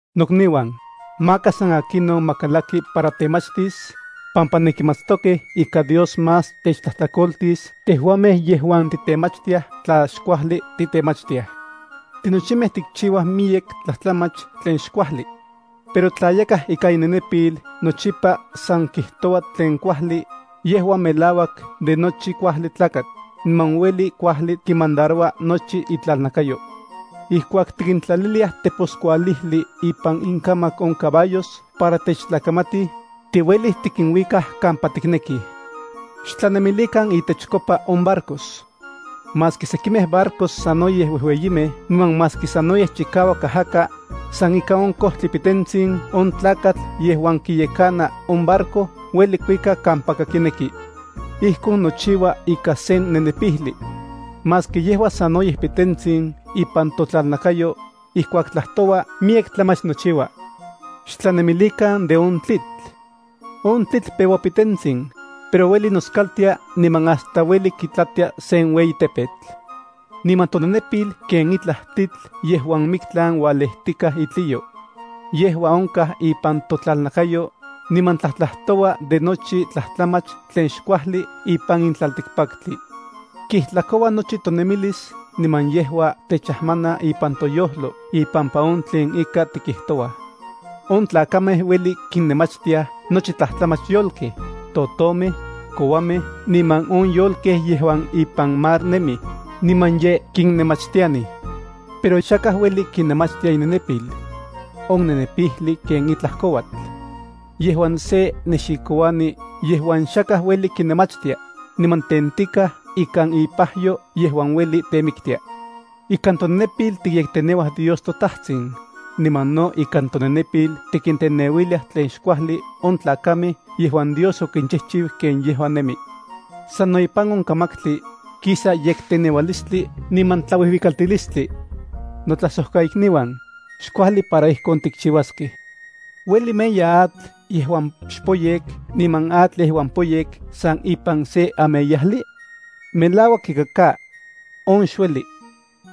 Nokniuan, maka san akinon ma kalaki para temachtis, pampa nenkimatstokej ika Dios más techtlajtlakoltis tejuamej yejuan titemachtiaj tla xkuajli titemachtiaj. Tinochimej tikchiuaj miyek tlajtlamach tlen xkuajli. Pero tla yakaj ikan inenepil nochipa san kijtoua tlen kuajli, yejua melauak de nochi kuajli tlakatl, niman ueli kuajli kimandaroua nochi itlalnakayo. Ijkuak tikintlaliliaj teposkualijli ipan inkamak on caballos para techtlakamatij, tiuelij tikinuikaj kampa tiknekij. Xtlanemilikan intechkopa on barcos. Maski sekimej barcos sanoyej uejueyimej niman maski sanoyej chikauak ajaka, san ika sen kojtli pitentsin on tlakatl yejuan kiyekana on barco ueli kuika kampaka kineki. Ijkon nochiua ikan sen nenepijli. Maski yejua sanoyej pitentsin ipan totlalnakayo, ijkuak tlajtoua miyek tlamach nochiua. Xtlanemilikan de on tlitl. On tlitl peua pitentsin, pero ueli noskaltia niman hasta ueli kitlatia sen ueyi tepetl. Niman tonenepil ken itlaj tlitl yejuan miktlan ualejtikaj itliyo. Yejua onkaj ipan totlalnakayo, niman tlajtlajtoua de nochi tlajtlamach tlen xkuajli ipan in tlaltikpaktli. Kijtlakoua nochi tonemilis niman yejua techajmana ipan toyojlo ipampa on tlen ika tikijtouaj. On tlakamej uelij kinnemachtiaj nochi tlajtlamach yolkej, totomej, kouamej niman on yolkej yejuan ipan mar nemij, niman ye kinnemachtianij. Pero xakaj ueli kinemachtia inenepil. On nenepijli ken itlaj kouatl. Yejua sen nexikouani yejuan xakaj ueli kinemachtia, niman tentikaj ikan ipajyo yejuan ueli temiktia. Ikan tonenepil tikyekteneuaj Dios toTajtsin, niman no ikan tonenepil tikinteneuiliaj tlen xkuajli on tlakamej yejuan Dios okinchijchiu ken yejua nemi. Sano ipan on kamaktli, kisa yekteneualistli niman tlauijuikaltilistli. Notlajsojkaikniuan, xkuajli para ijkon tikchiuaskej. ¿Ueli meya atl yejuan xpoyek niman atl yejuan poyek san ipan se ameyajli? ¡Melauak ika ka! On xueli.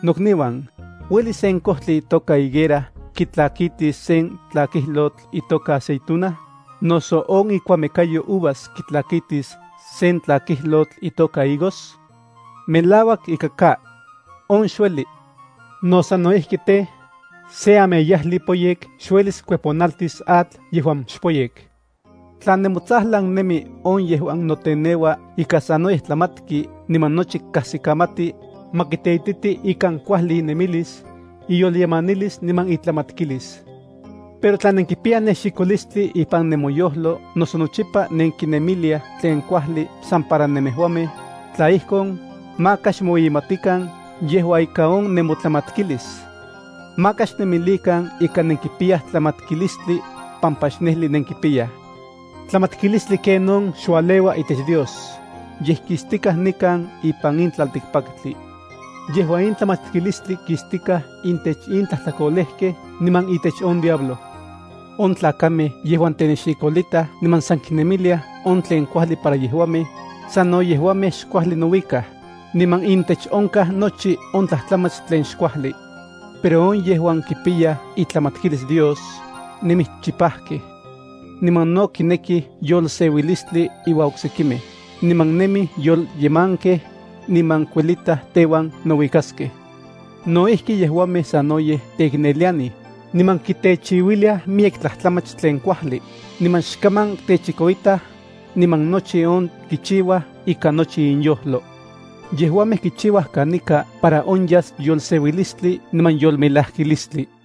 Nokniuan, ¿ueli sen kojtli itoka higuera kitlakitis sen tlakijlotl itoka aceituna, noso on ikuamekayo uvas kitlakitis sen tlakijlotl itoka higos? ¡Melauak ika ka! On xueli. No sano ijki tej, sen ameyajli poyek xuelis kueponaltis atl yejuan xpoyek. Tla nemotsajlan nemi on yejuan noteneua ika sanoyej tlamatki niman nochi kajsikamati, ma kiteititi ikan kuajli inemilis, iyolyemanilis niman itlamatkilis. Pero tla nenkipiyaj nexikolistli ipan nemoyojlo noso nochipa nenkinemiliaj tlen kuajli san para nemejuamej, tla ijkon, maka xmoueyimatikan yejua ika on nemotlamatkilis. Maka xnemilikan ika nenkipiyaj tlamatkilistli, pampa xnejli nenkipiyaj. Tlamatkilistli ken on xualeua itech Dios, yej kistikaj nikan ipan in tlaltikpaktli. Yejua in tlamatkilistli kistikaj intech in tlajtlakolejkej niman itech on diablo. On tlakamej yejuan tenexikolitaj niman san kinemiliaj on tlen kuajli para yejuamej, sano yejuamej xkuajli nouikaj, niman intech onkaj nochi on tlajtlamach tlen xkuajli. Pero on yejuan kipiyaj itlamatkilis Dios, nemij chipajkej. Niman no kinekij yolseuilistli inuan oksekimej, niman nemij yolyemankej, niman kuelitaj teuan nouikaskej. No ijki yejuamej sanoyej teiknelianij, niman kitechiuiliaj miyek tlajtlamach tlen kuajli, niman xkaman techikoitaj, niman nochi on kichiuaj ikan nochi inyojlo. Yejuamej kichiuaj kanika para onyas yolseuilistli niman yolmelajkilistli.